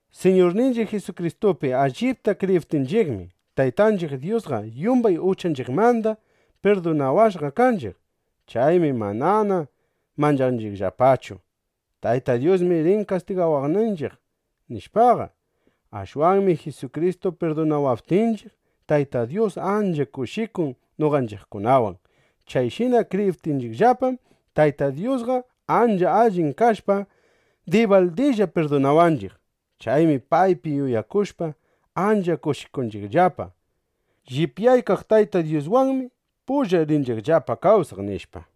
Siñurninchiq Jisukristupi allipta kriyiptinchiqmi, Taytanchiq Dyusqa yumbay uchanchiqmanda pirdunawashqa kanchiq. Chaymi manana manchanchiqllapachu: Tayta Dyusmi rin kastigawaqninchiq, nishpaqa. Ashwanmi Jisukristu pirdunawaptinchiq, Tayta Dyus ancha kushikun noqanchiqkunawan. Chayshina kriyiptinchiqllapam, Tayta Dyusqa ancha allin kashpa, dibaldilla pirdunawanchiq. Chaymi paypi yuyakushpa, ancha kushikunchiqllapa: Llipyaykaq Tayta Dyuswanmi pulla rinchiqllapa kawsaq, nishpa.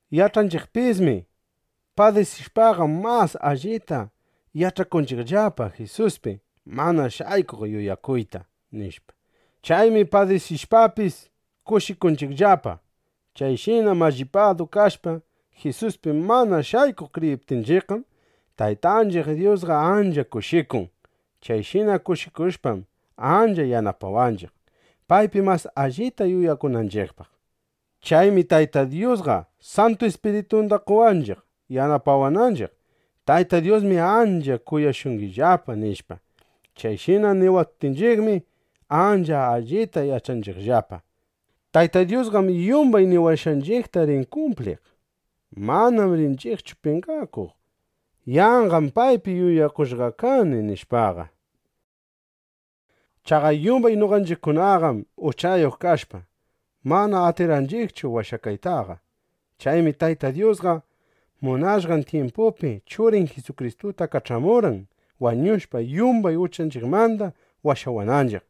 Yach'anchiqpismi: Padisishpaqam, mas allita yach'akunchiqllapa Jisuspi mana shaykuq yuyakuyta, nishpa. Chaymi padisishpapis, kushikunchiqllapa. Chayshina mallipadu kashpa, Jisuspi mana shaykuq kriyiptinchiqqam, Taytanchiq Dyusqa ancha kushikun. Chayshina kushikushpam, ancha yanapawanchiq, paypi mas allita yuyakunanchiqllapa. Chaymi Tayta Dyusqa Santu Ispiritunda qowanchiq, yach'achiwananchiq: Tayta Dyusmi ancha kuyashungillapa, nishpa. Chayshina niwaptinchiqmi, ancha allita yach'anchiqllapa: Tayta Dyusqam yumbay niwashqanchiqta rin kumpliq. Manam rinchiqchu penqakuq: Yanqam paypi yuyakushqa kani, nishpaqa. Chaqa yumbay noqanchiqkunaqam (uchayuq kashpa) mana atirqanchiqchu washakaytaqa. Chaymi Tayta Dyusqa munashqan tyimpupi Churin Jisukristuta kach'amurqan, wañushpa yumbay uchanchiqmanda washawananchiq.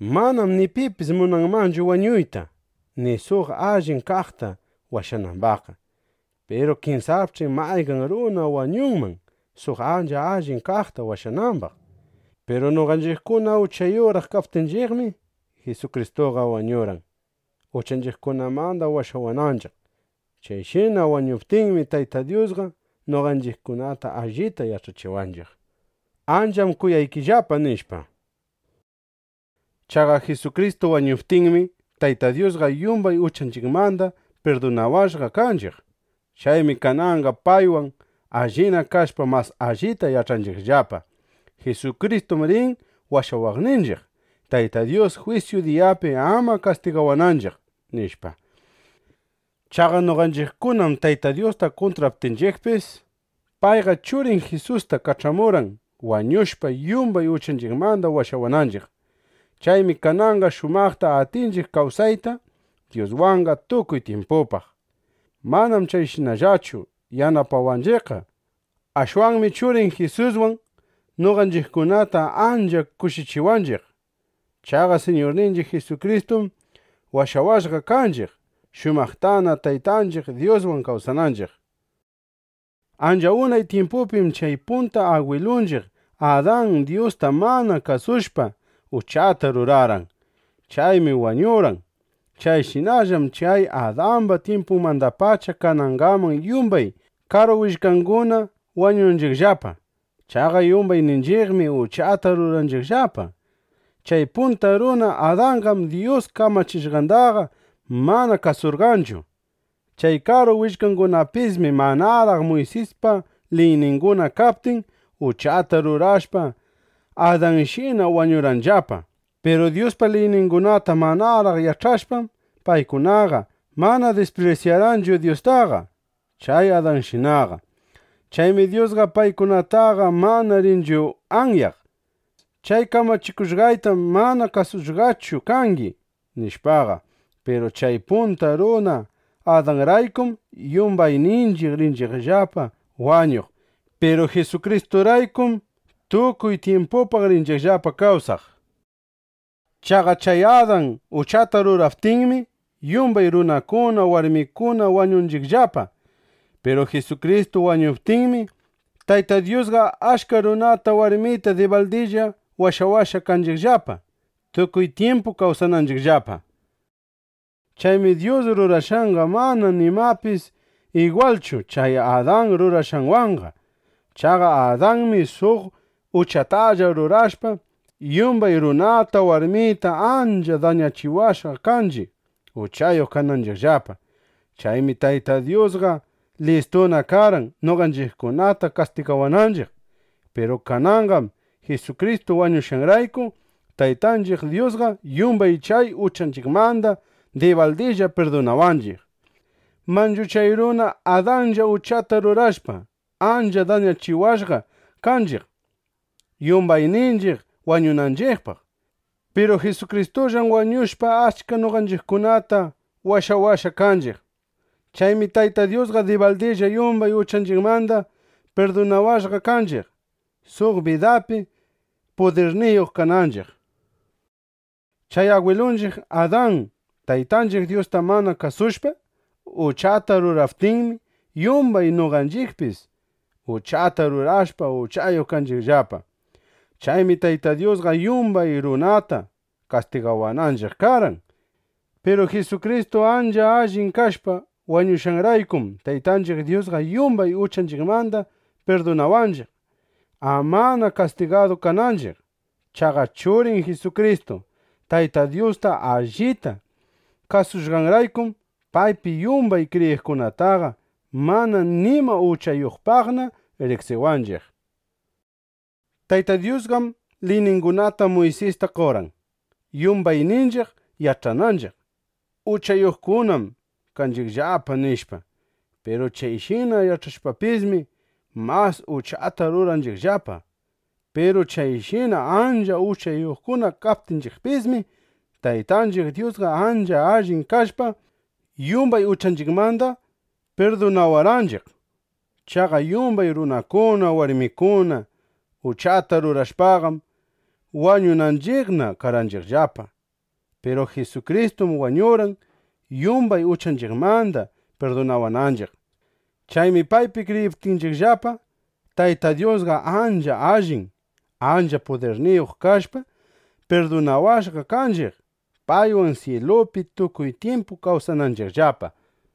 Manam ni pipis munanmanchu wañuyta, ni suq allin kaqta washanambaqqa. Piru kinsapch'i mayqan runa wañunman, suq ancha allin kaqta washanambaq. Piru noqanchiqkuna uchayuqraq kaptinchiqmi, Jisukristuqa wañurqan, uchanchiqkunamanda washawananchiq. Chayshina wañuptinmi, Tayta Dyusqa noqanchiqkunata allita yach'achiwanchiq: Ancham kuyaykillapa, nishpa. Chaqa Jisukristu wañuptinmi, Tayta Dyusqa yumbay uchanchiqmanda pirdunawashqa kanchiq. Chaymi kananqa paywan allina kashpa, mas allita yach'anchiqllapa: Jisukristum rin washawaqninchiq, Tayta Dyus jwisyu diyapi ama kastigawananchiq, nishpa. Chaqa noqanchiqkunam Tayta Dyusta kuntraptinchiqpis, payqa Churin Jisusta kach'amurqan, wañushpa, yumbay uchanchiqmanda washawananchiq. Chaymi kananqa shumaqta atinchiq kawsayta Dyuswanqa tukuy tyimpupaq. Manam chayshinallachu yanapawanchiqqa. Ashwanmi Churin Jisuswan noqanchiqkunata ancha kushichiwanchiq. Chaqa Siñurninchiq Jisukristum washawashqa kanchiq, shumaqtana Taytanchiq Dyuswan kawsananchiq. Ancha unay tyimpupim chay punta agwilunchiq Adan Dyusta mana kasushpa, uchata rurarqan. Chaymi wañurqan. Chayshinallam chay Adamba tyimpunmandapacha kanangaman yumbay karu willkanguna wañunchiqllapa. Chaqa yumbayninchiqmi uchata ruranchiqllapa. Chay punta runa Adanqam Dyus kamachishqandaqa mana kasurqanchu. Chay karu willkangunapismi manaraq Muysispa liyninguna kaptin, uchata rurashpa, Adanshina wañurqanllapa. Piru Dyuspa liyningunata manaraq yach'ashpam, paykunaqa mana disprisyarqanchu Dyustaqa chay Adanshinaqa. Chaymi Dyusqa paykunataqa mana rinchu anyaq: “Chay kamachikushqaytam mana kasushqachu kangi”, nishpaqa. Piru chay punta runa Adanraykum yumbayninchiq rinchiqllapa wañuq. Piru Jisukristuraykum tukuy tyimpupaq rinchiqllapa kawsaq. Chaqa chay Adan uchata ruraptinmi, yumbay runakuna, warmikuna wañunchiqllapa. Piru Jisukristu wañuptinmi, Tayta Dyusqa achka runata, warmita dibaldilla washawashqa kanchiqllapa, tukuy tyimpu kawsananchiqllapa. Chaymi Dyus rurashqanqa mana nimapis igwalchu chay Adan rurashqanwanqa. Chaqa Adanmi suq uchatalla rurashpa, yumbay runata, warmita ancha dañachiwashqa kanchiq, uchayuq kananchiqllapa. Chaymi Tayta Dyusqa listuna karqan, noqanchiqkunata kastigawananchiq. Piru kananqam Jisukristu wañushqanrayku, Taytanchiq Dyusqa yumbay chay uchanchiqmanda dibaldilla pirdunawanchiq. Manchu chay runa Adanlla uchata rurashpa, ancha dañachiwashqa kanchiq, yumbayninchiq wañunanchiqpaq. Piru Jisukristullam wañushpa, achka noqanchiqkunata washawashqa kanchiq. Chaymi Tayta Dyusqa dibaldilla yumbay uchanchiqmanda pirdunawashqa kanchiq, suq bidapi pudirniyuq kananchiq. Chay agwilunchiq Adan Taytanchiq Dyusta mana kasushpa, uchata ruraptinmi, yumbay noqanchiqpis uchata rurashpa, uchayuq kanchiqllapa. Chaymi Tayta Dyusqa yumbay runata kastigawananchiq karqan. Piru Jisukristu ancha allin kashpa wañushqanraykum, Taytanchiq Dyusqa yumbay uchanchiqmanda pirdunawanchiq, amana kastigadu kananchiq. Chaqa Churin Jisukristu Tayta Dyusta allita kasushqanraykum, paypi yumbay kriyiqkunataqa mana nima uchayuqpaqna riqsiwanchiq. Tayta Dyusqam liyningunata Muysista qorqan, yumbayninchiq yach'ananchiq: Uchayuqkunam kanchiqllapa, nishpa. Piru chayshina yach'ashpapismi, mas uchata rurarqanchiqllapa. Piru chayshina ancha uchayuqkuna kaptinchiqpismi, Taytanchiq Dyusqa ancha allin kashpa, yumbay uchanchiqmanda pirdunawarqanchiq. Chaqa yumbay runakuna, warmikuna uchata rurashpaqam, wañunanchiqna karqanchiqllapa. Piru Jisukristum wañurqan, yumbay uchanchiqmanda pirdunawananchiq. Chaymi paypi kriyiptinchiqllapa, Tayta Dyusqa ancha allin, ancha pudirniyuq kashpa, pirdunawashqa kanchiq, paywan syilupi tukuy tyimpu kawsananchiqllapa.